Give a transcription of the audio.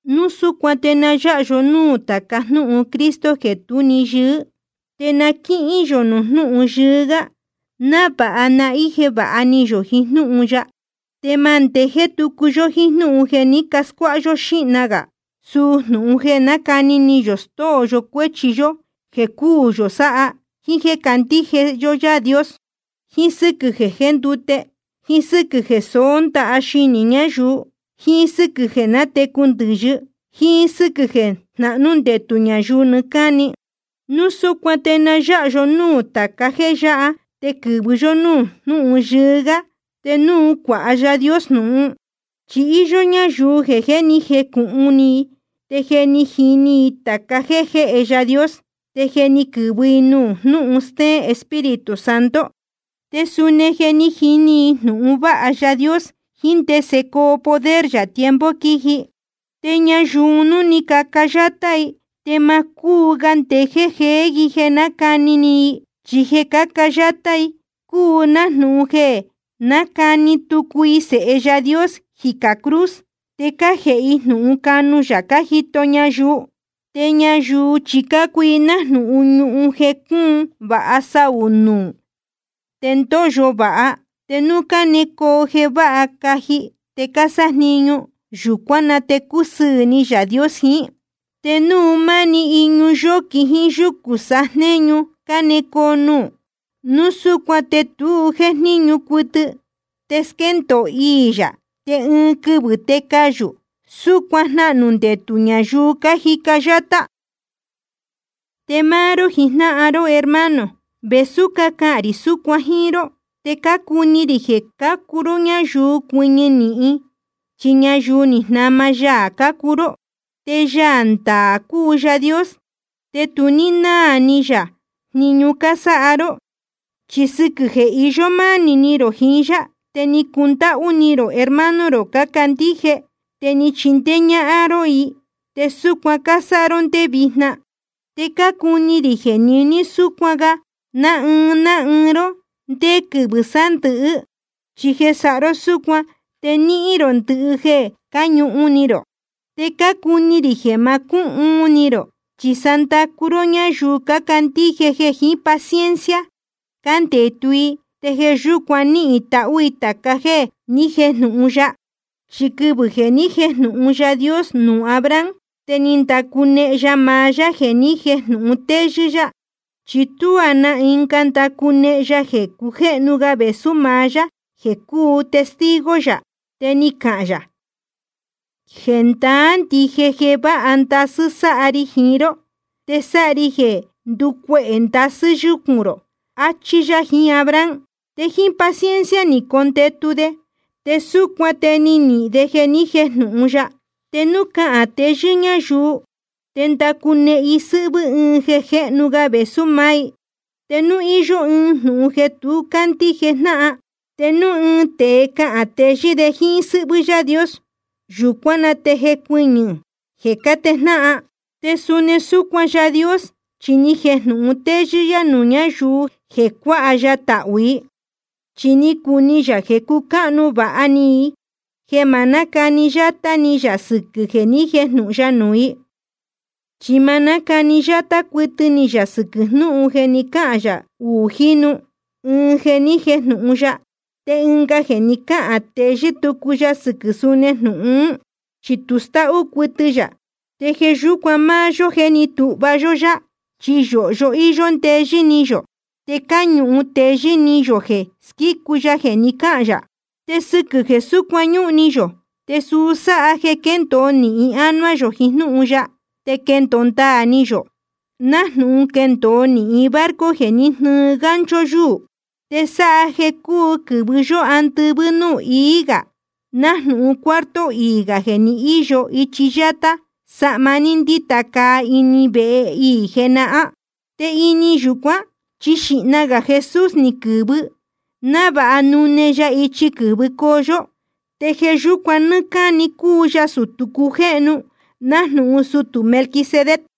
Núu súcuan te na yáha yó núū tāca jnúhun Cristo jeē tú‑ni yɨɨ́, te na quíhín yō nuū jnúhun yɨɨ́ gá, návāha na íje vāha ni yō jiín jnúhun ya. Te ma ndejéé tucu yó jíín jnúhun jeē ni scuáha yó xíhna gā, suu jnūhun jeē nácani ni yō stóo yo cuéchi yó jéē cúū yō sáha, jíín jéē candíje yó Yaā Dios, jíín sɨ́quɨ̄ jeē jéndute, jíín sɨ́quɨ̄ jeē soó ndaha xinī ñáyuu, jíín sɨ́quɨ̄ jeē nátecu ndɨ̄yɨ, jíín sɨ́quɨ̄ jeē jnahnú ndetū ñayuu nɨɨ́ cáni. Núu súcuan te na yáha yó núū tāca jéē yáha te quɨ̄vɨ yó núū jnúhun yɨɨ́ gá, te núu cuāha Yaā Dios jnūhun. Chi íyó ñáyuu jeē jé ni jecūhun ni i, te je ni jini i tāca jéē jéhe Yaā Dios, te je ni quɨ̄vɨ i nuū jnúhun stéén Espíritu Santo, te suni je ni jini i jnūhun vāha Yaā Dios jiín ndese coo poder yā tiempo quiji. Te ñayuu un núu caca yátá i, te ma cúu ga ndejéé jeé i jeē nácani ni i. Chi jeē cáca yátá i cúu nájnūhun jeē nácahni tucu i Sēhe Yaā Dios jicā cruz, te cájēhe i jnūhun canu yā cájito ñayuu. Te ñayuu chi cácuu i nájnūhun ñuhun jeē cúun vāha saū nuū te ndóyo vāha. Te núu cánecoo jeē váha caji tēe cásájniñu, yūcuán na te cúsɨɨ̄ ni Yaā Dios jiín. Te núu máni iñu yóquin jíín yucū sajnéñu cánecoo nuū, núu súcuan te tu jéjníñu cuɨtɨ, te squéndōo iī yā, te ɨɨn quɨvɨ̄ te cayū. Súcuan jnahnū ndetū ñayuu cájica yátá. Te máá ró jijnáhan ró hermano, vēsú cácahān rī súcuan jíín ró, te cácucáhnu ni rī jeē cácuu ró ñayuu cuɨñɨ nīhin, chi ñayuu ni jnama ya cácuu ró. Te Yaā ndaā cúu Yaā Dios, te tu náā ni yā jniñu cásáha ró. Chi sɨquɨ̄ jeē cáhīyo manī rō jiín yá te ni cacundáhú ni rō hermano rō cácandíje, te ni cachindéé ñáhán ró i, te súcuan cásáha ró ndé vijna. Te cácuni rī jeē niní súcuan sáha ga ná ɨɨn ná ɨɨn ró ndé quɨvɨ̄ sándɨ̄hɨ́, chi jeē sáha ró súcuan te nihīn rō ndɨhɨ jeē cáñuhun ni rō. Te cácuni rī jeē ma cúhuun ni rō, chi sa ndacu ró ñáyuu cácandíje jeē jiín paciencia cándetu i, te jeē yúcuan níhīn tahú i tāca jéē ni jéjnūhun ya. Chi quɨvɨ̄ jeē ni jéjnūhun Yaā Dios nuū Abraham, te ni ndacunehen ya maá yá jeē ni jéjnūhun téyɨ́ yá, chi tuá na ɨnga ndacunehen ya jeē cujéhnu ga vēsú maá yá jeē cuu testigo yā. Te ni cahān yā: Jendaá ndije jeē vāha ndasɨ́ sáha ri jiín ró, te sáha ri jeē nducuehē ndasɨ́ yúcūn rō, achí yá jiín Abraham. Te jíín paciencia ni condetu de, te súcuan te ni nihīn de jeē ní jejnūhun ya. Te núu cáhán teyɨ́ ñáyuu, te ndácunehen i sɨ́hvɨ́ ɨɨn jeē cujéhnu ga vēsú maá i. Te núu íyó ɨɨn jnūhun jeē tu cácandíje jnáhan, te núu ɨɨn tēe cáhán teyɨ́ de jíín sɨ́hvɨ́ Yaā Dios, yūcuán na te jécuɨñɨ̄ jeē cátejnáhan. Te suni súcuan Yaā Dios, chi ni jejnūhun téyɨ́ yá nuū ñáyuu jeē cuāha ya tahū i. Chi ni cuni yā jeē cucáhnu vāha ni i jeē ma nácani yátá ni yā sɨquɨ̄ jeē ni jéjnūhun ya nuū i. Chi ma nácani yátá cuɨtɨ ni yā sɨquɨ̄ jnúhun jeē ni cáhān yā uū jínu, ɨɨn jeē ni jéjnūhun ya, te ɨnga jeē ni cáhān teyɨ́ tucu ya sɨquɨ̄ suni jnūhun ún. Chi tu stáhú cuɨtɨ yā. Te jeē yúcuan máá yó jeē ní tūhva yó yá, chi yōhyo íyó ndeyɨ́ ni yō, te cáñuhun teyɨ́ ni yō jeē squícu ya jeē ni cáhān yā. Te sɨquɨ̄ jeē súcuan ñúhun ni yō, te suu sáha jeē quéndōo nīhin ánuá yō jiín jnúhun ya, te quéndōo ndaā ni yō, nájnūhun quéndōo nīhin barco jeē jnɨ́ɨ gancho yuū. Te sáha jeē cúu quɨ̄vɨ yó andɨvɨ́ núū ií gā, nájnūhun cuarto iī gā jeē ni íyo ichi yátá sahma ni ndita caa ini vehe iī jenahán. Te ini yūcuán chi xīhna gā Jesús ni quɨ̄vɨ, návāha nune ya ichi quɨ̄vɨcoo yó. Te jeē yúcuan nɨ́ɨ́ cáni cúu ya sutū cujéhnu nájnūhun sutū Melquisedec.